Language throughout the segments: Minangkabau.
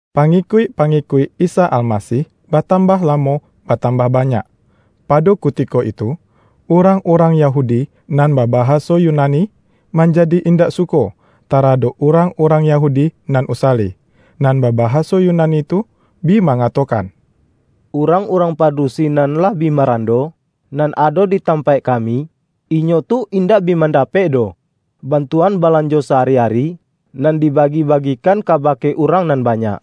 Pangikuik-pangikuik Isa Almasih batambah lamo batambah banyak. Pado kutiko itu, urang-urang Yahudi nan babahaso Yunani, manjadi indak suko taradok urang-urang Yahudi nan usali. Nan babahaso Yunani tu bi mangatokan,”Urang-urang padusi nan lah bi marando nan ado di tampaik kami, inyo tu indak bi mandapek doh bantuan balanjo sa-ari-ari, nan dibagi-bagikan kabake urang nan banyak.”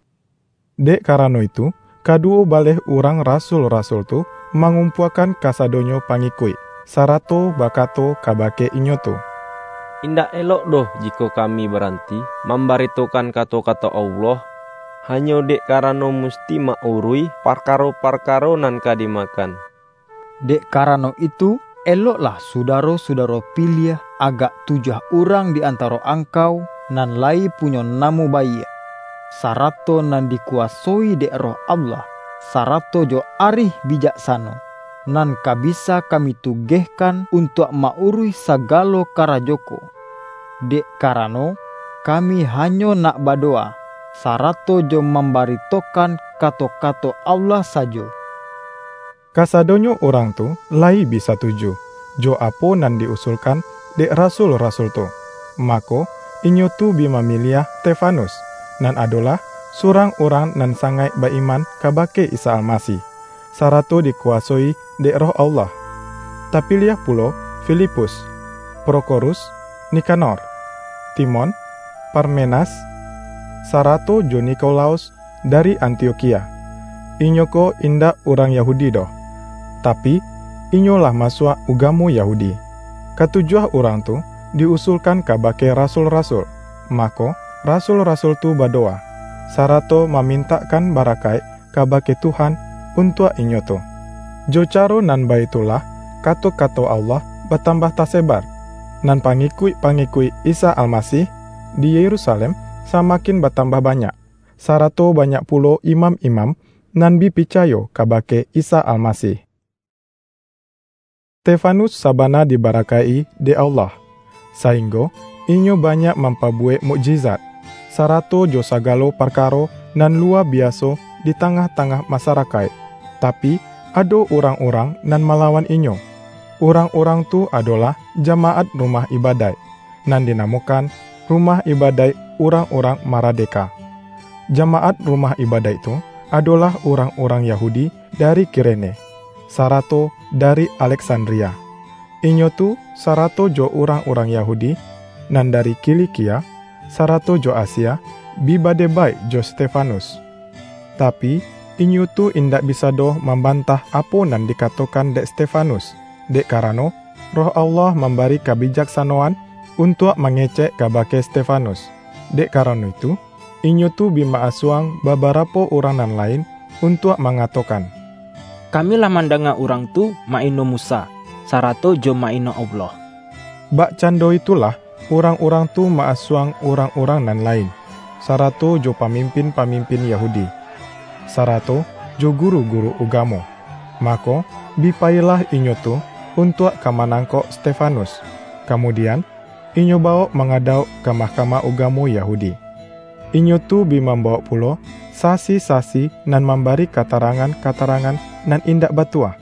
Dek karano itu, kaduwo baleh urang rasul-rasul tu mangumpuakan kasadonyo pangikuik, sarato bakato kabake inyo tu,”Indak elok doh jikok kami baranti mambaritokan kato-kato Allah, hanyo dek karano musti ma-uruih parkaro-parkaro nan ka dimakan. Dek karano itu, eloklah Sudaro-sudaro piliah agak tujuah urang di antaro angkau, nan layi punyo namo baiak, sarato nan dikuwasoi dek Roh Allah, sarato jo arih bijaksano, nan ka bisa kami tugehkan untuak ma-uruih sagalo karajo ko; dek karano, kami hanyo nak badowa, sarato jo mambaritokan kato-kato Allah sajo.” Kasadonyo urang tu layi bi satuju, jo apo nan di-usulkan dek rasul-rasul tu. Mako, inyo tu bi mamiliah Stefanus, nan adolah surang urang nan sangaik ba-iman kabake Isa Almasih, sarato dikuwasoi dek Roh Allah. Tapiliah pulo: Filipus, Prokhorus, Nikanor, Timon, Parmenas, sarato jo Nikolaus dari Antiokhia; inyo ko indak urang Yahudi doh, tapi, inyo lah masuak ugamo Yahudi. Katujuah urang tu di-usulkan kabake rasul-rasul, mako, rasul-rasul tu badowa, sarato mamintakkan barakaik kabake Tuhan untuak inyo tu. Jo caro nan baitulah kato-kato Allah batambah tasebar, nan pangikuik-pangikuik Isa Almasih di Yerusalem samakin batambah banyak. Sarato banyak pulo imam-imam nan bi picayo kabake Isa Almasih. Stefanus sabana dibarakaik-i dek Allah, sainggo inyo banyak mampabuwek mukjizat, sarato jo sagalo parkaro nan luwa biaso di tangah-tangah masarakaik. Tapi, ado urang-urang nan malawan inyo; urang-urang tu adolah jamaat rumah ibadaik, nan dinamokan Rumah ibadaik Urang-urang Maradeka. Jamaat rumah ibadaik tu, adolah urang-urang Yahudi dari Kirene, sarato dari Aleksandria. Inyo tu, sarato jo urang-urang Yahudi nan dari Kilikia, sarato jo Asia, bi badebaik jo Stefanus. Tapi, inyo tu indak bisa doh mambantah apo nan dikatokan dek Stefanus, dek karano Roh Allah mambari kabijaksanoan untuak mangecek kabake Stefanus. Dek karano itu, inyo tu bi ma-asuang babarapo urang nan lain, untuak mangatokan,”Kami lah mandanga urang tu ma-ino Musa, sarato jo ma-ino Allah!” Bakcando itulah urang-urang tu ma-asuang urang-urang nan lain, sarato jo pamimpin-pamimpin Yahudi, sarato jo guru-guru ugamo. Mako, bi payilah inyo tu untuak ka manangkok Stefanus, kamudian, inyo bawok mangadauk ka Mahkamah Ugamo Yahudi. Inyo tu bi mambawok pulo, sasi-sasi nan mambari katarangan-katarangan nan indak batua,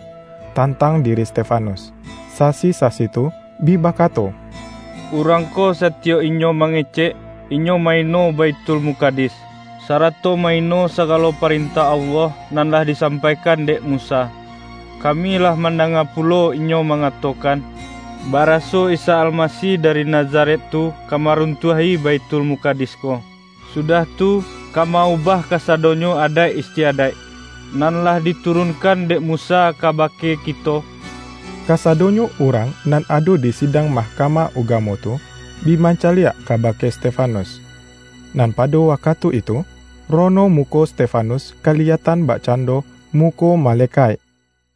tantang diri Stefanus. Sasi-sasi tu bi bakato,”Urang ko satiyok inyo mangecek, inyo ma-ino Baithulmukadis, sarato ma-ino sagalo parentah Allah nan lah disampaikan dek Musa. Kami lah mandanga pulo inyo mangatokan, baraso Isa Almasih dari Nazaret tu ka maruntuah-i Baithulmukadis ko, sudah tu, ka ma-ubah kasadonyo adaik istiadaik, nan lah diturunkan dek Musa kabake kito!” Kasadonyo urang nan ado di sidang Mahkamah Ugamo tu, bi mancaliak kabake Stefanus. Nan pado wakatu itu, rono muko Stefanus kaliyatan bakcando muko malekaik. RIWAYAIK RASUL-RASUL